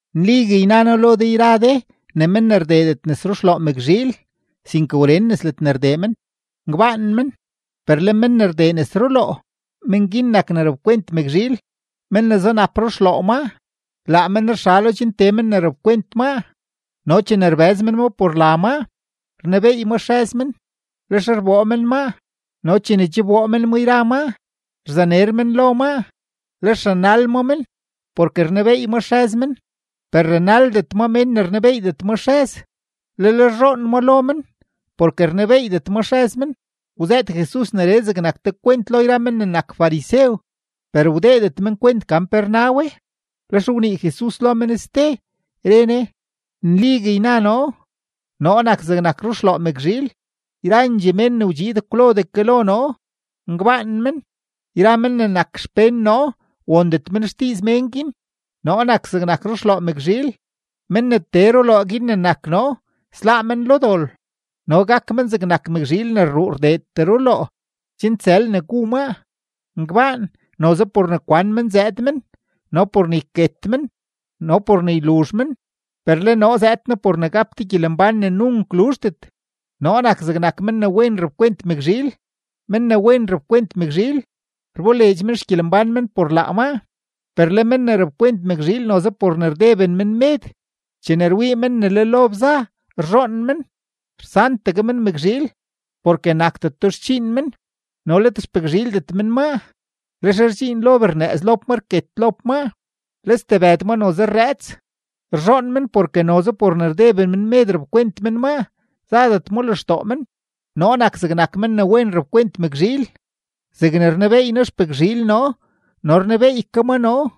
’Nligue yna noo lo de yra de ne men ne rdeedet nes ruxloo mëkzhiil, sinke wren nes ledne rdee men, ngbaan men, per le men ne rdee nes ruloo, men guin nak ne rapkwent mëkzhiil. Men ne zunap ruxloo maa, laa men rxalo chen tee men ne rapkwent maa, no chene rbëz men ma por la maa, rnebeey ma xrëz men, lex rboo men maa. No chene che wboo men ma yra maa, rzaner men lo maa, lex ranal ma men porke rnebeey ma xrëz men. Per ranaldet ma mén ne rnebeeydet maa xrëz, lel rzhoon ma lo men porke rnebeeydet ma xrëz men. Wzëët Jesus neree zegnak te kwent lo men ne nak farisew, per wdeedet men kwent gan pe rna we. Lex wnii Jesus lo men ste, re Ne: ―Nligue yna noo: Noo nak zegnak ruxloo mëkzhiil. Yrandxee mén ne wdxiid kwlodee ke lo noo, ngbaan men; yra men ne nak xpén noo wondet men xdiiz mén guin. Noo nak zegnak ruxloo mëkzhiil; men ne tee ruloo guin ne nak noo, sláá men lo dol. No gak men zegnak mëkzhiil ne rruu rdeetee ruloo chen tsël ne gu maa. ’Ngbaan, noze por ne kwan men zëëd men no por ne yket men no por ne yluzh men. Per le noo zëëd noo por ne gap de gyelembán ne nunk luzhdet. Noo nak zegnak men ne wen rapkwent mëkzhiil; men ne wen rapkwent mëkzhiil, rboleedx men xgyelembán men por laa maa. Per le men ne rapkwent mëkzhiil noze por ne rdeben men med, chene rwii men ne le lob za, rzhoon men, rsantegue men mëkzhiil, porke nakdeto xdxiin men no let xpëkzhiildet men maa. Lex rdxiin lob rnëëz lob ma rket lob ma, le stebëd ma noze rrëëts. Rzhoon men porke noze por ne rdeben men med rapkwent men maa, zadet ma lextoo men. ’Noo nak zegnak men ne wen rapkwent mëkzhiil; zegne rnebeey noo xpëkzhiil noo no rnebeey ke ma noo,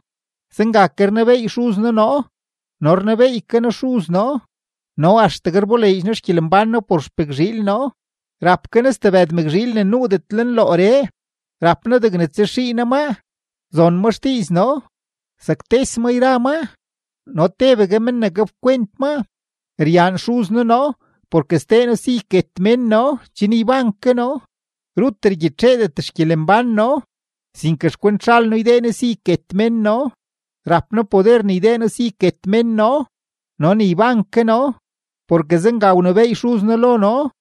zenga ke rnebeey Xuz noo noo no rnebeey ke noo Xuz noo. No axtegue rboleedx noo xgyelembán noo por xpëkzhiil noo. Rap ke noo stebëd mëkzhiil ne nuudet lenlooree; rap noo degne tsaxii no maa, zon ma xdiiz noo, saktes ma yra maa no tebegue men ne gapkwent maa. ’Ryaan Xuz noo noo porke sdee noo si yket mén noo chen yban ke noo. Rut rgyitxeedet xgyelembán noo, sinke xkwent zhal noo ydee noo si yket mén noo. Rap noo poder ne ydee noo si yket mén noo no ne yban ke noo, porke zenga wnebééy Xuz noo lo noo.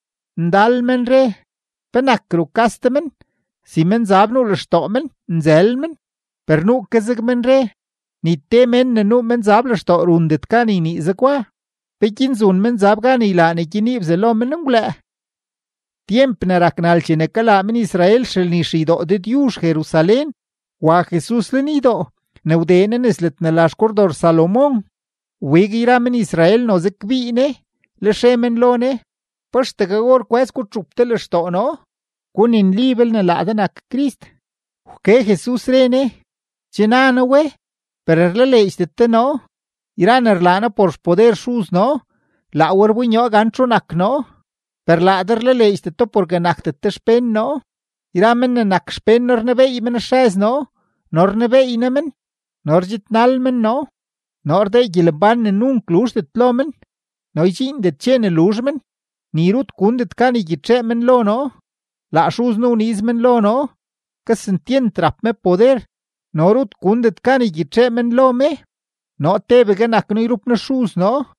Ndal men re: ―¿Penak rukas de men, si menzab nuu lextoo men, nzël men? Per nuu ke zeg men re: ―Ni te mén ne nuu menzab lextoo rundet gan ynii zegwa. ¿Peguin zun menzab gan ylaa ne gyenii bzalo menngwlëë? Tyemp ne rak nal chene kalaa men-Israel xelni xeydoo Dëdyuzh Jerusalén, wa Jesus lenydoo. Ne wdee Ne nes ledne la xKordor Salomón, wbig yra men-Israel noze kbii Ne, lex re men lo Ne: ―¿Pa axtegue or kwë́z gutxup de lextoo noo? Guninli belne laa de nak Crist. Wke Jesus, re Ne: ―Che na noo we, per rlaleedxdet de noo. Yra ne rlaa noo por xpoder Xuz noo, laa we rbonyoo gan txu nak noo. Per laa de rlaleedxdet do porke nakdet de xpén noo. Yra men ne nak xpén noo rnebeey men xrëz noo no rnebeey noo men no rdxidnal men noo. Noo rdee gyelembán ne nunk luzhdet lo men, no ydxiindet dxe ne luzh men, ni rut gundet gan ygyitxee men lo noo. Laa Xuz noo wniiz men lo noo, kesentyent rap me poder, no rut gundet gan ygyitxee men lo me. Noo tebegue nak noo yrup noo Xuz noo.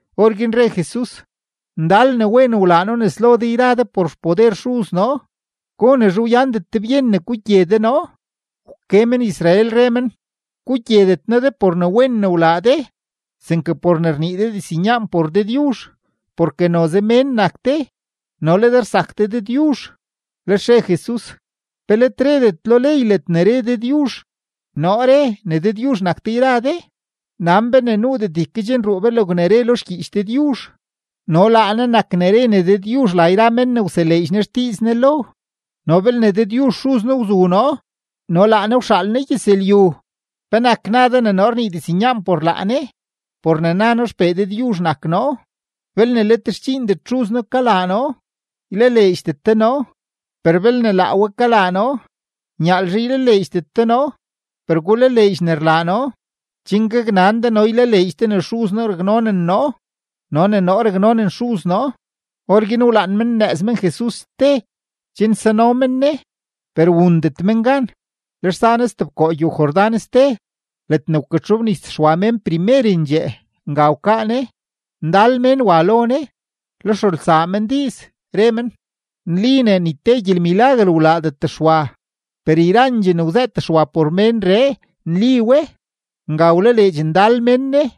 Orguin re Jesus: ―Ndal ne wen wlaa noo nes lo de yra de por xpoder Xuz noo. ¿Gonezhe wyandet de byen ne gugye de noo? Wke men-Israel, re men: ―Gugyedet noo de por ne wen ne wlaa de, sinke por ne rnii de diznyaan por Dëdyuzh. Porke noze mén nak de, no le de rsak de Dëdyuzh. Lex re Jesus: ―¿Pe let redet lo ley ledne re Dëdyuzh: “Noo re ne dëdyuzh nak de yra de”? Nan be ne nuudet ykedxnruu be logne re lo xgyiich Dëdyuzh, no laa Ne nak ne re ne dëdyuzh la yra mén ne wseleedx Ne xdiiz Ne lo. No belne Dëdyuzh Xuz noo wzu noo no laa Ne wxaal noo gyëzlyu, ¿penak na de ne noo rnii diznyaan por laa Ne, por ne na noo XPee Dëdyuzh nak noo? Belne let xdxiindet Xuz noo kalaa noo, ylaleedxdet de noo. Per belne laa we kalaa noo, nyaalzhe ylaleedxdet de noo, per gulaleedx ne rlaa noo, chen gaknan de no le ylaleedx de ne Xuz noo raknonen noo no ne noo raknonen Xuz noo. Orguin wlaan men nnëëz men Jesus ste chen nzano men Ne, per wundet men gan. Lex za Ne stebkoo gyow-Jordán ste ledne wkatxobnis Xwa mén primerendxee, nga wkaa Ne. Ndal mén wa lo Ne, lex rulsaa men diiz, re men: ―Nli ne ni te gyelmilaguer wlaadet Xwa, per yrandxee ne wzëët Xwa por ménree, nli we. Nga wlaleedx ndal mén Ne.